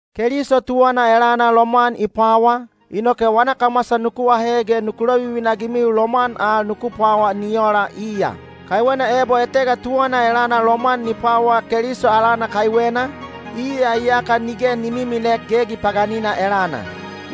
Keliso tuwana elana lomwan i pwawa, inoke wana kamwasa nuku ahe ge nuku lovivina-agimiu lomwan al nuku pwawa ni ola iya. Kaiwena ebo etega tuwana elana lomwan ni pwawa Keliso alana kaiwena, iya iyaka nige ni miminek gegi paganina elana.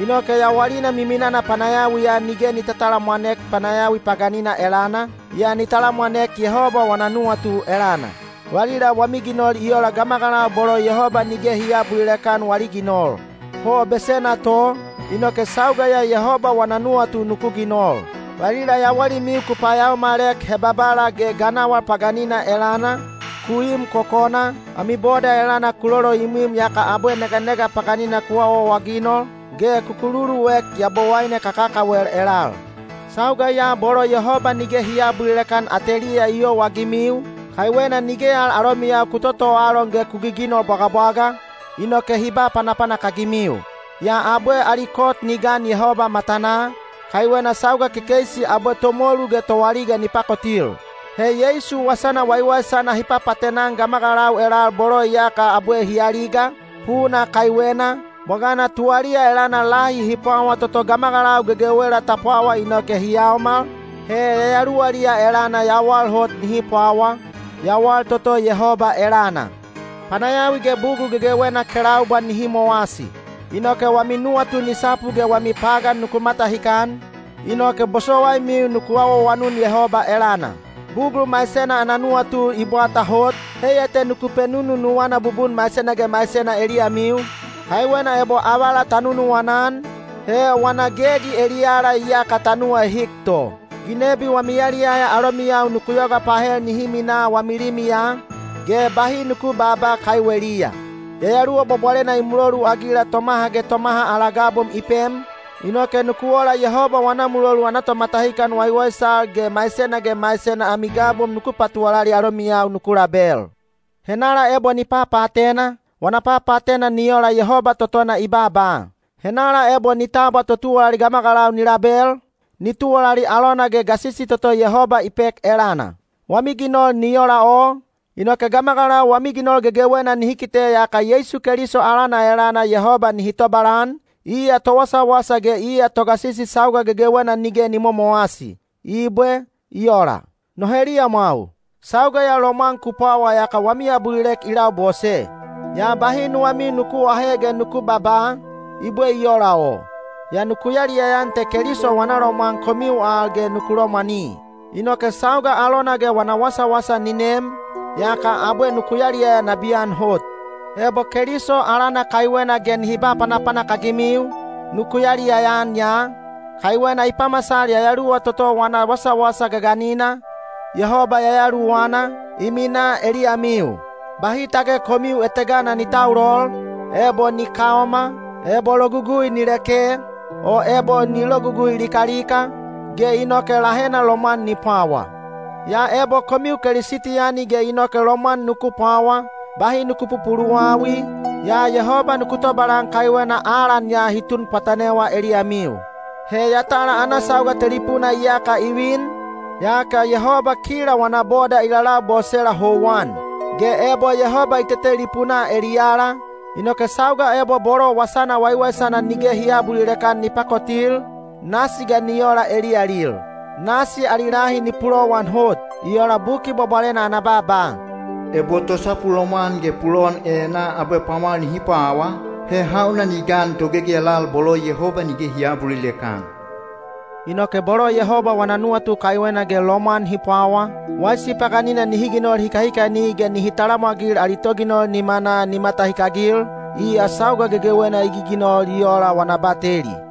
Inoke yawalina miminana panayawiya nige ni tatalamwanek panayawi paganina elana, yaa ni talamwanek Yehoba wana nuwatu elana. Valila wami ginol i ola gamagalau bolo Yehoba nige hi aabulilek-an wali ginol. Ho besena to, inoke sauga ya Yehoba wana nuwatu nuku ginol. Valila yawalimiu ku payaomalek hebabala ge ganawal paganina elana, ku im kokona, ami boda elana ku loloimwim yaka abwe neganega paganina ku awaawaginol, ge ku kululuek yabowaine kakakawel elal. Sauga ya bolo Yehoba nige hi aabulilek-an ateliya i youagimiu, kaiwena nige al alomiyau ku totoalon ge ku giginol bwagabwaga, inoke hi ba panapanak-agimiu. Yaa abwe ali kot ni gan Yehoba matanaa, kaiwena sauga kekeisi abwe tomolu ge toaliga ni pakotil. He Yeisu wasana waiwaisana hi papaatena-an gamagalau elal bolo iyaka abwe hi aliga, puna kaiwena, bwagana tuwaliya elana lahi hi pwawa toto gamagalau gegewela ta pwawa inoke hi yaomal, he yayaluwaliya elana yawal hot nihi pwawa, yawal toto Yehoba elana. Panayawi ge bugul gegewena kelaubwa nihi mowasi. Inoke wami nuwatu ni sapu ge wami pagan nuku matahikan, inoke bosowaimiu nuku awaawanun Yehoba elana. Bugul maisena ana nuwatu i bwata hot, heiya te nuku penununuwana bubun maisena ge maisena eliyamiu, kaiwena ebo avala ta nunuwana-an, he wana gegi eliyala iyaka ta nuwaehik to. Ginebi wami yaliyaya alomiyau nuku yoga pahel nihi minaa wami limiya, ge bahi nuku baaba kaiweliya. Yayaluwa Bwabwalena i muloluagila tomaha ge tomaha ala gabom i pem, inoke nuku ola Yehoba wana mulolu ana tomatahikan waiwaisal ge maisena ge maisena ami gabom nuku patuwalali alomiyau nuku label. Henala ebo ni papaatena, wana papaatena ni ola Yehoba totona i baaba. Henala ebo ni tabwa totuwalali gamagalau ni label, ni tuwalali alona ge gasisi toto Yehoba i pek elana. Wami ginol ni ola o, inoke gamagalau wami ginol gegewena nihi kite yaka Yeisu Keliso alana elana Yehoba nihi tobalan, iya towasawasa ge iya togasisi sauga gegewena nige ni momowasi. Ibwe. I ola. No heliyamwau, sauga ya lomwan ku pwawa yaka wami abulilek i labose. Yaa bahi nuwamiu nuku aahe ge nuku babaa, “I bwe i ola o?” Yaa nuku yaliyaya-an te Keliso wana lomwan komiu al ge ku lomwani. Inoke sauga alona ge wana wasawasa ni nem, yaka abwe nuku yaliyaya nabiyan hot. Ebo Keliso alana kaiwena ge hi ba panapanak-agimiu, nuku yaliyaya-an ya, kaiwena i pamasal Yayaluwa toto wana wasawasa gaganina, Yehoba Yayaluwana, i minaa eliyamiu. Bahi tage komiu etegana ni taulol, ebo ni kaoma, ebo logugui ni leke, o ebo ni logugui likalika, ge inoke lahena lomwan ni pwawa. Yaa ebo komiu Kelisitiyani ge inoke lomwan nuku pwawa, bahi nuku pupuluwawi, yaa Yehoba nuku tobalan kaiwena alan ya hi tun pwatanewa eliyamiu. He yatala ana sauga telipuna iyaka i vin, yaka Yehoba kila wana boda i lalabosela houwan. Ge ebo Yehoba i tetelipunaa eliyala, inoke sauga ebo bolo Wasana Waiwaisana nige hi aabulilek-an ni pakotil, nasi ga ni ola eliyalil? Nasi ali lahi ni pulowan hot! I ola Buki Bwabwalena ana baaba, “Ebo tosapu lomwan ge pulowan enaa abwe pwamwal nihi pwawa, he hauna ni gan togegi elal bolo Yehoba nige hi aabulilek-an?” Inoke bolo Yehoba wana nuwatu kaiwena ge lomwan hi pwawa, waisi paganina nihi ginol hikahikani ge nihi talamwagil ali Toginol nimanaa ni matahikagil, iya sauga gegewena i giginol i ola wana bateli.